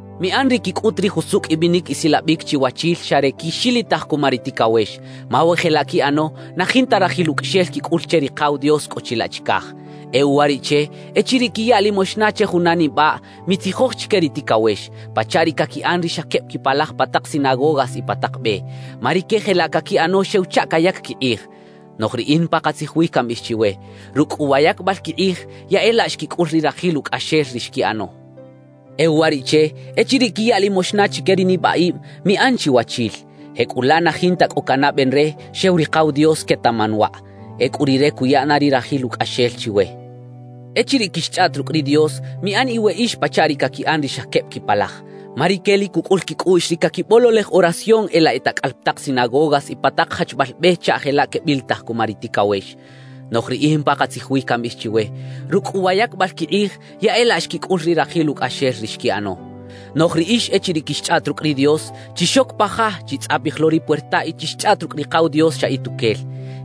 »Miꞌan ri quicꞌut ri jusucꞌ ibinic isilabic chiwachil xa re quixilitaj cuma ri ticawex; ma we jelaꞌ quiꞌano, na jinta rajil ucꞌaxel quicꞌul che Rikaw Dios cꞌo chilaꞌ chicaj. E uwariꞌche, echiriꞌ quiya limoxna che juna nibaꞌ, mitzijoj chique ri ticawex, pachaꞌ ri caquiꞌan ri xa queb quipalaj pa tak sinagogas y pa tak be. Ma rique jelaꞌ caquiꞌano xew chaꞌ cayac quikꞌij. Noꞌj riꞌin pakatzij wi cambiꞌij chiwe: Rucꞌ cꞌu wa yacbal quikꞌij, ya e laꞌ xquicꞌul ri rajil ucꞌaxel ri xquiꞌano. E uwariꞌche, echiriꞌ quiya limoxna chique ri nibaꞌib, miꞌan chiwachil. Jecꞌulaꞌ na jinta cꞌo canaꞌben re, xew Rikaw Dios quetaꞌman waꞌ. Ecꞌu Rire cuya na ri rajil ucꞌaxel chiwe. »Echiriꞌ quixchꞌaꞌt rucꞌ ri Dios, miꞌan iweꞌix pachaꞌ ri caquiꞌan ri xa queb quipalaj. Ma rique lic cucꞌul quicꞌuꞌx ri caquibololej oración e laꞌ e tacꞌal pa tak sinagogas y pa tak jachbal be chaꞌ jelaꞌ quebilitaj cuma ri ticawex. Noꞌj riꞌin pakatzij wi cambiꞌij chiwe: Rucꞌ cꞌu wa yacbal quikꞌij, ya e laꞌ xquicꞌul ri rajil ucꞌaxel ri xquiꞌano. Noꞌj riꞌix echiriꞌ quixchꞌaꞌt rucꞌ ri Dios, chixoc pa ja, chitzꞌapij lo ri puerta y chixchꞌaꞌt rucꞌ Rikaw Dios xa ituquel;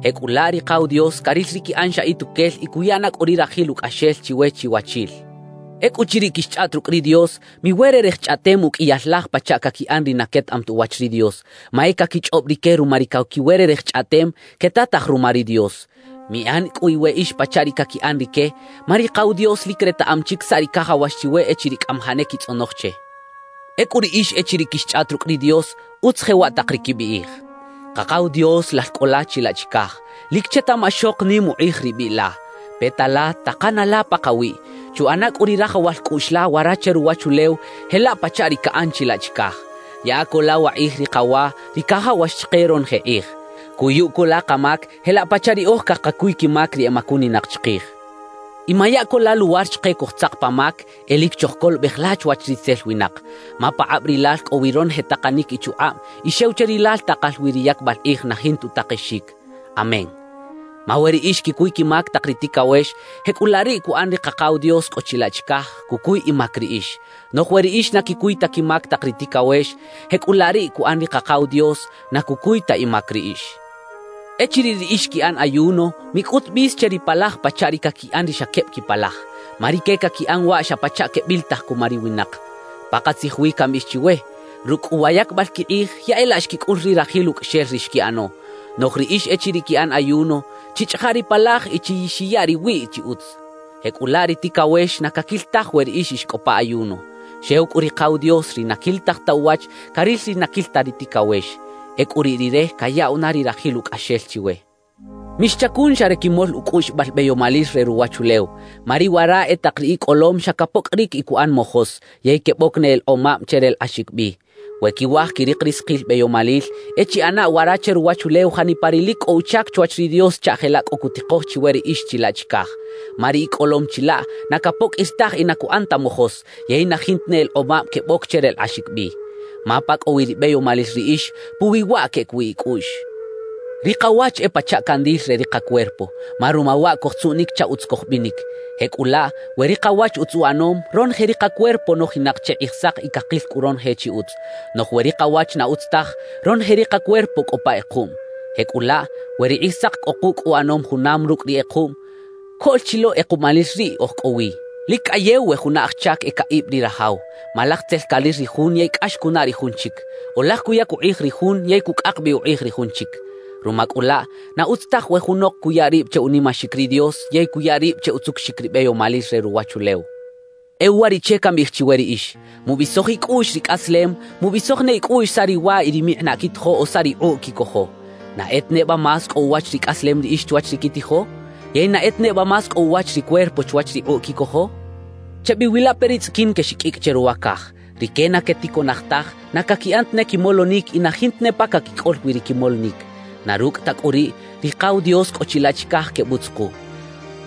jecꞌulaꞌ Rikaw Dios caril ri quiꞌan xa ituquel y cuya na cꞌu ri rajil ucꞌaxel chiwe chiwachil. »Ecꞌuchiriꞌ quixchꞌaꞌt rucꞌ ri Dios, miwererej chꞌaꞌtem uqꞌuiyal laj pachaꞌ caquiꞌan ri na quetaꞌam ta uwach ri Dios; ma e caquichꞌob rique ruma ri caquiwererej chꞌaꞌtem, quetataj ruma ri Dios. Miꞌan cꞌu iweꞌix pachaꞌ ri caquiꞌan rique, ma Rikaw Dios lic retaꞌam chic saꞌ ri cajawax chiwe echiriꞌ cꞌamajaꞌ ne quitzꞌonoj che. »Ecꞌu riꞌix echiriꞌ quixchꞌaꞌt rucꞌ ri Dios utz jewaꞌ tak ri quibiꞌij: Kakaw Dios, Lal cꞌo la chilaꞌ chicaj, ¡lic chetaꞌmaxok nim ukꞌij ri biꞌ la! Peta la, takana la pakawiꞌ; chuꞌana cꞌu ri rajawal cꞌuꞌx la wara che ruwachulew, jelaꞌ pachaꞌ ri caꞌan chilaꞌ chicaj. Yaꞌa co la wakꞌij ri kawa, ri cajawax chike ronoje kꞌij. Cuyu co la kamac, jelaꞌ pachaꞌ riꞌoj cakacuy quimac ri emacuninak chikij. Y maya co la luwar chike cojtzak pa mac; e lic chojcolobej la chwach ritzel winak. Ma pakꞌab Rilal cꞌo wi ronoje takanic y chukꞌab; y xew che Rilal takal wi ri yacbal kꞌij na jinta utakexic. Amén. »Ma we riꞌix quicuy quimac tak ri ticawex, jecꞌulaꞌ riꞌ cuꞌan ri Kakaw Dios cꞌo chilaꞌ chicaj, cucuy imac riꞌix. Noꞌj we riꞌix na quicuy ta quimac tak ri ticawex, jecꞌulaꞌ riꞌ cuꞌan ri Kakaw Dios, na cucuy ta imac riꞌix. »Echiriꞌ riꞌix quiꞌan ayuno, micꞌut bis che ripalaj pachaꞌ ri caquiꞌan ri xa queb quipalaj. Ma rique caquiꞌan waꞌ xa pachaꞌ quebilitaj cuma ri winak. Pakatzij wi cambiꞌij chiwe: Rucꞌ cꞌu wa yacbal quikꞌij, ya e laꞌ xquicꞌul ri rajil ucꞌaxel ri xquiꞌano. Noꞌj riꞌix echiriꞌ quiꞌan ayuno, chichꞌaja ripalaj y chixiya riwiꞌ chi utz. Jecꞌulaꞌ ri ticawex na caquil taj we riꞌix ix cꞌo pa ayuno. Xew cꞌu Rikaw Dios, ri na quilitaj ta uwach, caril ri na caquil ta ri ticawex. Ecꞌu riꞌ Rire cayaꞌw na ri rajil ucꞌaxel chiwe. »Mixchacun xa re quimol ucꞌuꞌxibal beyomalil re ruwachulew, ma ri wara e tak ri icꞌolom xa capoqꞌuiric y cuꞌan mojos, yey queboc ne elekꞌomab che relekꞌaxic bi. We quiwaj quirik ri sakil beyomalil, e chiꞌana wara che ruwachulew janipa ri lic cꞌo uchac chwach ri Dios chaꞌ jelaꞌ cꞌo cutikoj chiwe riꞌix chilaꞌ chicaj. Ma ri icꞌolom chilaꞌ na capoqꞌuir taj y na cuꞌan ta mojos, yey na jinta ne elekꞌomab queboc che relekꞌaxic bi. Ma pa cꞌo wi ribeyomalil riꞌix, puwi waꞌ queꞌec wi icꞌuꞌx. »Ri kawach e pachaꞌ candil re ri kacuerpo, ma ruma waꞌ cojtzuꞌnic chaꞌ utz cojbinic. Jecꞌulaꞌ, we ri kawach utz uꞌanom, ronoje ri kacuerpo nojinak che kꞌijsak y cakil cꞌu ronoje chi utz. Noꞌj we ri kawach na utz taj, ronoje ri kacuerpo cꞌo pa kꞌekuꞌm. Jecꞌulaꞌ, we ri kꞌijsak cꞌo kucꞌ uꞌanom junam rucꞌ ri kꞌekuꞌm, ¡coꞌl chi lo kꞌekuꞌmalil riꞌ oj cꞌo wi! »Lic cꞌayew we juna aj chac e caꞌib ri rajaw. Ma laj tzel caril ri jun yey cꞌax cunaꞌ ri jun chic; o laj cuyac ukꞌij ri jun yey cucꞌak bi ukꞌij ri jun chic. Ruma cꞌu laꞌ, na utz taj we junok cuya rib che unimaxic ri Dios yey cuya rib che utzucuxic ri beyomalil re ruwachulew. »E uwariꞌche cambiꞌij chiwe riꞌix: Mubisoj icꞌuꞌx ricꞌaslem; mubisoj ne icꞌuꞌx saꞌ riwa y rimikꞌinaꞌ quitijo o saꞌ rikꞌuꞌ quicojo. ¿Na e ta neba más cꞌo uwach ricꞌaslem riꞌix chwach ri quitijo? ¿Yey na e ta neba más cꞌo uwach ri cuerpo chwach rikꞌuꞌ quicojo? »Chebiwilape ri tzꞌiquin quexiqꞌuicꞌ che ruwa caj. Rique na queticoꞌnaj taj, na caquiꞌan tane quimolonic y na jinta ne pa caquicꞌol wi ri quimolonic. Na rucꞌ ta cꞌu riꞌ, Rikaw Dios cꞌo chilaꞌ chicaj quebutzuku.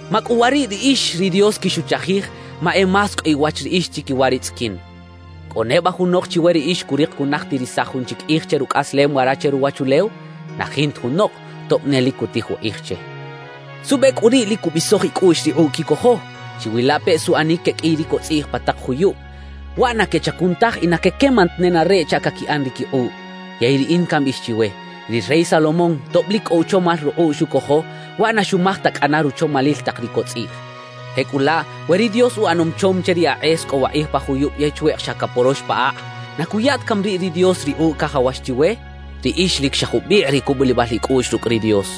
¡Macꞌuwariꞌ riꞌix, ri Dios quixuchajij, ma e más cꞌo iwach riꞌix chiquiwa ri tzꞌiquin! »¿Cꞌo neba junok chiwe riꞌix curik cunajtirisaj jun chic kꞌij che rucꞌaslem wara che ruwachulew? Na jinta junok, tob ne lic cutij ukꞌij che. ¿Suꞌbe cꞌu riꞌ lic cubisoj icꞌuꞌx rikꞌuꞌ quicojo? Chiwilapeꞌ suꞌanic queqꞌuiy ri cotzꞌiꞌj pa tak juyub; waꞌ na quechacun taj y na quequeman ta nenareꞌ chaꞌ caquiꞌan ri quikꞌuꞌ. Yey riꞌin cambiꞌij chiwe: Ri rey Salomón, tob lic cꞌo uchomal rukꞌuꞌ xucojo, waꞌ na xumaj ta cꞌana ruchomalil tak ri cotzꞌiꞌj. Jecꞌulaꞌ we ri Dios uꞌanom chom che ri akꞌes cꞌo wakꞌij pa juyub yey chweꞌk xa caporox pa akꞌ, ¿na cuya ta cami riꞌ ri Dios rikꞌuꞌ cajawax chiwe? ¡Riꞌix lic xa jubikꞌ ri cubulibal icꞌuꞌx rucꞌ ri Dios!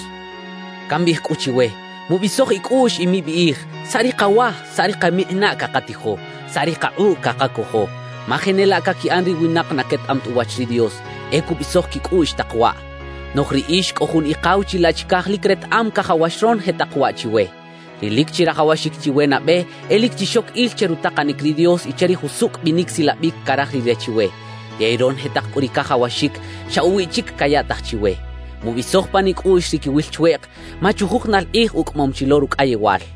»Cambiꞌij cꞌu chiwe: Mubisoj icꞌuꞌx y mibiꞌij: “¿Saꞌ ri kawa, saꞌ ri kamikꞌinaꞌ cakatijo? ¿Saꞌ ri kakꞌuꞌ cakacojo?” Ma jenelaꞌ caquiꞌan ri winak na quetaꞌam ta uwach ri Dios, e cubisoj quicꞌuꞌx tak waꞌ. Noꞌj riꞌix cꞌo jun Ikaw chilaꞌ chicaj lic retaꞌam cajawax ronoje tak waꞌ chiwe. »Ri lic chirajawaxic chiwe nabe e lic chixoc il che rutakanic ri Dios y che ri jusucꞌ binic silabic caraj Rire chiwe. Yey ronoje tak cꞌu ri cajawaxic, xa uwiꞌ chic cayaꞌtaj chiwe. Mubisoj pan icꞌuꞌx ri quiwil chweꞌk, ma chujujunal kꞌij ucꞌamom chi lo rucꞌayewal.